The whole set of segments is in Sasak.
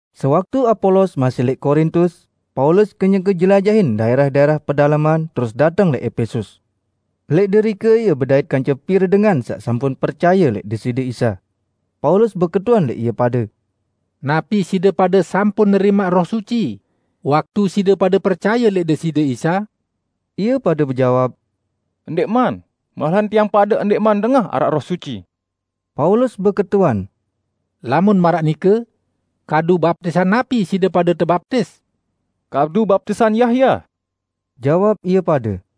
Sewaktu Apolos masih lẽq Korintus, Paulus kenyeke jelajahin daẽrah-daẽrah pedaleman terus dateng lẽq Epesus. Lẽq derike ie bedait kance pire dengan saq sampun percaye lẽq Deside Isa. Paulus beketuan lẽq ie pade, "Napi side pade sampun nerimaq Roh Suci waktu side pade percaye lẽq Deside Isa?" Ie pade bejawab, "Ndẽqman, malahan tiang pade ndẽqman dengah araq Roh Suci." Paulus beketuan, "Lamun maraq nike, kadu baptisan napi side pade tebaptis?" "Kadu baptisan Yahya," Jawab ie pade.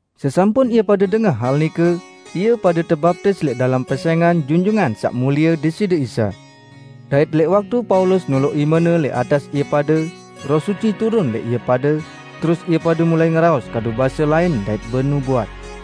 Sesampun ie pade dengah hal nike, ie pade tebaptis lẽq dalem pesẽngan Junjungan Saq Mulie Deside Isa. Dait lẽq waktu Paulus noloq imene lẽq atas ie pade, Roh Suci turun lẽq ie pade, terus ie pade mulai ngeraos kadu base lain dait benubuat.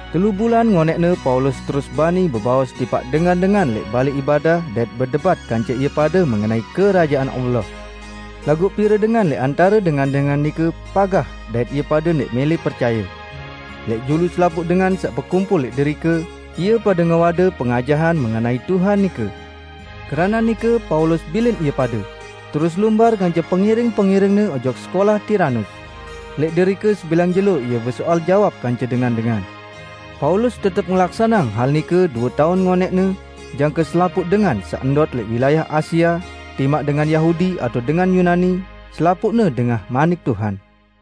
Telu bulan ngonẽqne Paulus terus bani bebaos tipaq dengan-dengan lẽq balẽ ibadah dait bedebat kance ie pade mengenai Kerajaan Allah. Laguq pire dengan lẽq antare dengan-dengan nike pagah dait ie pade ndẽq mẽlẽ percaye. Lẽq julu selapuq dengan saq bekumpul lẽq derike, ie pade ngewade pengajahan mengenai Tuhan nike. Keranaq nike Paulus bilin ie pade, terus lumbar kance pengiring-pengiringne ojok sekolah Tiranus. Lẽq derike sebilang jelo ie besoal jawab kance dengan-dengan. Paulus tetep ngelaksaneang hal nike due taun ngonẽqne, jangke selapuq dengan saq ndot lẽq wilayah Asia, timaq dengan Yahudi atao dengan Yunani, selapuqne dengah Manik Tuhan.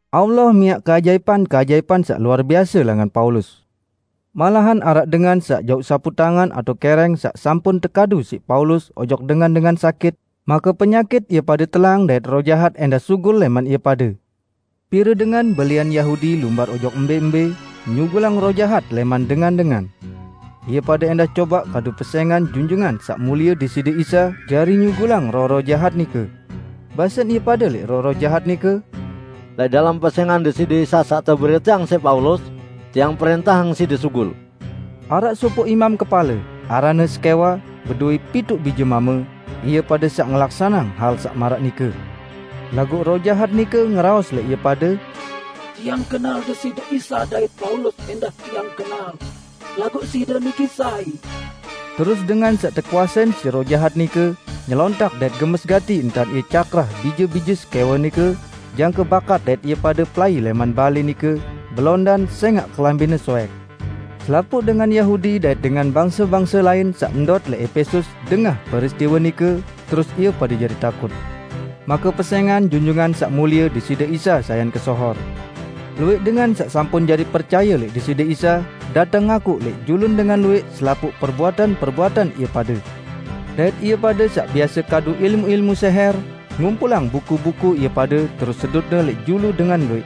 Allah miaq keajaipan-keajaipan saq luar biase langan Paulus. Malahan araq dengan saq jauq saputangan atao kẽrẽng saq sampun tekadu siq Paulus ojok dengan-dengan sakit, make penyakit ie pade telang dait roh jahat ẽndah sugul lẽman ie pade. Pire dengan belian Yahudi lumbar ojok mbẽ-mbẽ, nyugulang roh jahat lẽman dengan-dengan. Ie pade ẽndah cobaq kadu pesẽngan Junjungan Saq Mulie Deside Isa jari nyugulang roh-roh jahat nike. Basen ie pade lẽq roh-roh jahat nike, "Lẽq dalem pesẽngan Deside Isa saq teberiteang siq Paulus, tiang prẽntahang side sugul!" Araq sopoq imam kepale, aranne Skewa, bedowẽ pituq bije mame, ie pade saq ngelaksaneang hal saq maraq nike. Laguq roh jahat nike ngeraos lẽq ie pade, "Tiang kenal Deside Isa dait Paulus ẽndah tiang kenal, laguq side niki sai?" Terus dengan saq tekuasein siq roh jahat nike nyelontak dait gemes gati entan ie cakrah bije-bije Skewa nike jangke bakat dait ie pade pelai lẽman balẽ nike belondan sẽngaq kelambine soẽk. Selapuq dengan Yahudi dait dengan bangse-bangse lain saq ndot lẽq Epesus dengah peristiwe nike, terus ie pade jari takut. Make pesẽngan Junjungan Saq Mulie Deside Isa sayan kesohor. Luwẽq dengan saq sampun jari percaye lẽq Deside Isa, dateng ngakuq lẽq julun dengan luwẽq selapuq perbuatan-perbuatan ie pade. Dait ie pade saq biase kadu ilmu-ilmu sẽhẽr, ngumpulang buku-buku ie pade terus sedutne lẽq julu dengan luwẽq.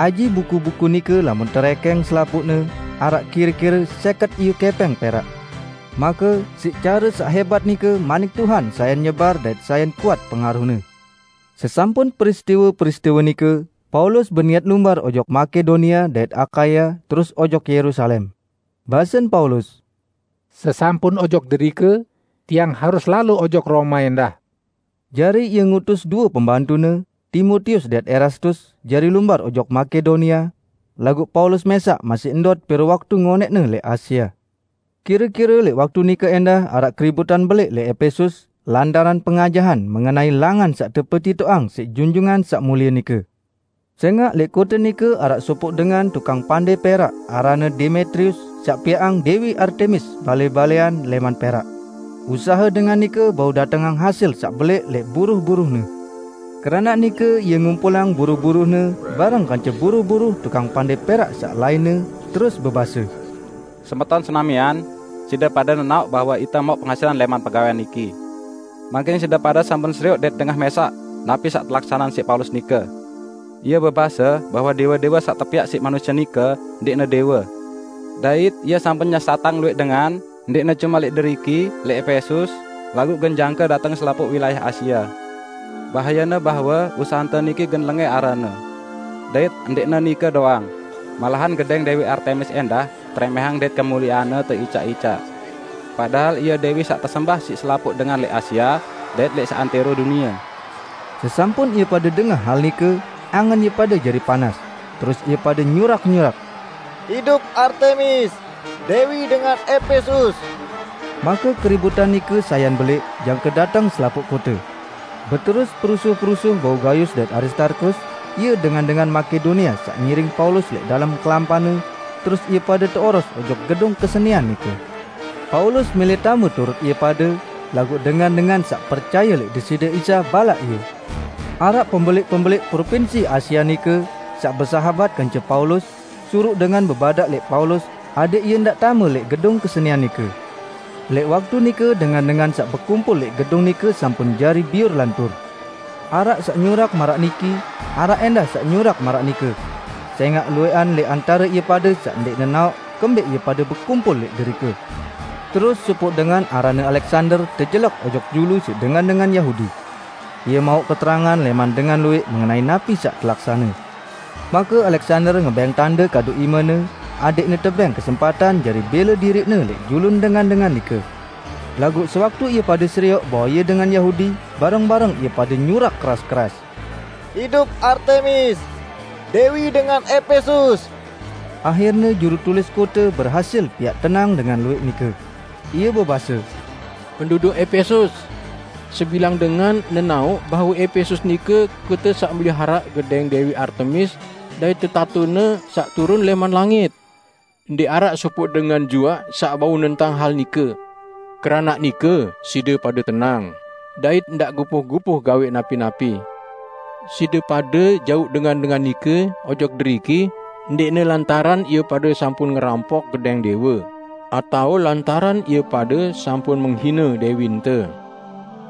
Aji buku-buku nike lamun terẽkẽng selapuqne, araq kire-kire sẽket iyu kẽpẽng perak. Make, siq care saq hẽbat nike manik Tuhan sayan nyebar dait sayan kuat pengaruhne. Sesampun peristiwe-peristiwe nike, Paulus beniat lumbar ojok Makedonia dait Akaya terus ojok Yerusalem. Basen Paulus, "Sesampun ojok derike, tiang harus lalo ojok Roma ẽndah." Jari ie ngutus due pembantune, Timotius dait Erastus jari lumbar ojok Makedonia, laguq Paulus mẽsaq masih ndot pire waktu ngonẽqne lẽq Asia. Kire-kire lẽq waktu nike ẽndah araq keributan belẽq lẽq Epesus lantaran pengajahan mengenai Langan saq tepetitoqang siq Junjungan Saq Mulie nike. Sẽngaq lẽq kote nike araq sopoq dengan tukang pandẽ perak aranne Demetrius saq piaqang Dewi Artemis balẽ-balẽan lẽman perak. Usahe dengan nike bau datengang hasil saq belẽq lẽq buruh-buruhne. Keranaq nike ie ngumpulang buruh-buruhne bareng kance buruh-buruh tukang pandẽ perak saq lainne, terus bebase, "Semeton senamian! Side pade nenaoq bahwe ite mauq pengasilan lẽman pegawẽan niki. Mangkin side pade sampun serioq dait dengah mẽsaq napi saq telaksaneang siq Paulus nike. Ie bebase bahwe dẽwe-dẽwe saq tepiaq siq manusie nike ndẽqne dẽwe. Dait ie sampun nyesatang luwẽq dengan, ndẽqne cume lẽq deriki, lẽq Epesus, laguq gen jangke dateng selapuq wilayah Asia. Bahayene bahwe usahente niki gen lengẽ aranne. Dait ndẽqne nike doang, malahan gedẽng Dẽwi Artemis ẽndah terẽmẽhang dait kemulieanne teicaq-icaq; padahal ie dẽwi saq tesembah siq selapuq dengan lẽq Asia dait lẽq seantẽro dunie!" Sesampun ie pade dengah hal nike, angen ie pade jari panas, terus ie pade nyurak-nyurak, "Idup Artemis, dẽwi dengan Epesus!" Make keributan nike sayan belẽq jangke dateng selapuq kote. Beterus perusuh-perusuh bau Gayus dait Aristarkus, ie dengan-dengan Makedonia saq ngiring Paulus lẽq dalem kelampanne, terus ie pade teoros ojok gedung kesenian nike. Paulus mẽlẽ tame turut ie pade, laguq dengan-dengan saq percaye lẽq Deside Isa balaq ie. Araq pembelẽq-pembelẽq propinsi Asia nike, saq besahabat kance Paulus, suruq dengan bebadaq lẽq Paulus adẽq ie ndaq tame lẽq gedung kesenian nike. Lẽq waktu nike dengan-dengan saq bekumpul lẽq gedung nike sampun jari biur lantur. Araq saq nyurak maraq niki, araq ẽndah saq nyurak maraq nike, sẽngaq luwẽqan lẽq antare ie pade saq ndẽq nenaoq kembẽq ie pade bekumpul lẽq derike. Terus sopoq dengan aranne Aleksander tejelek ojok julu siq dengan-dengan Yahudi. Ie mauq keterangan lẽman dengan luwẽq mengenai napi saq telaksane. Make Aleksander ngebẽng tande kadu imene adẽqne tebẽng kesempatan jari bẽle diriqne lẽq julun dengan-dengan nike. Laguq sewaktu ie pade serioq bahwe ie dengan Yahudi, bareng-bareng ie pade nyurak keras-keras, "Idup Artemis! Dẽwi dengan Epesus!" Ahirne jurutulis kote berhasil piaq tenang dengan luwẽq nike. Ie bebase, "Penduduk Epesus! Sebilang dengan nenaoq bahwe Epesus nike kote saq meliharaq gedẽng Dẽwi Artemis dait tetatone saq turun lẽman langit. Ndẽq araq sopoq dengan juaq saq bau nentang hal nike. Keranaq nike side pade tenang, dait ndaq gupuh-gupuh gawẽq napi-napi. Side pade jauq dengan-dengan nike ojok deriki ndẽqne lantaran ie pade sampun ngerampok gedẽng dẽwe atao lantaran ie pade sampun menghine dẽwinte.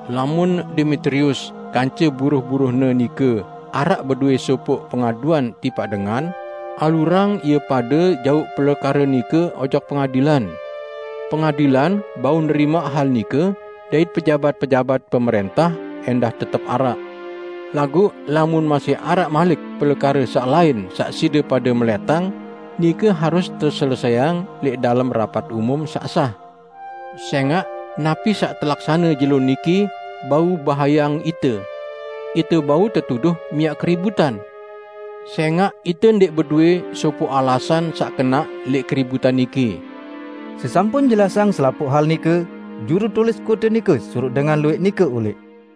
Lamun Demetrius kance buruh-buruhne nike araq bedowẽ sopoq pengaduan tipaq dengan, alurang ie pade jauq pelekare nike ojok pengadilan. Pengadilan bau nerimaq hal nike dait pejabat-pejabat pemrẽntah ẽndah tetep araq. Laguq lamun masih araq malik pelekare saq lain saq side pade melẽtang, nike harus teselesẽang lẽq dalem rapat umum saq sah. Sẽngaq napi saq telaksane jelo niki bau bahayeang ite. Ite bau tetuduh miaq keributan, sẽngaq ite ndẽq bedowẽ sopoq alasan saq kenaq lẽq keributan niki." Sesampun jelasang selapuq hal nike, jurutulis kote nike suruq dengan luwẽq nike ulẽq.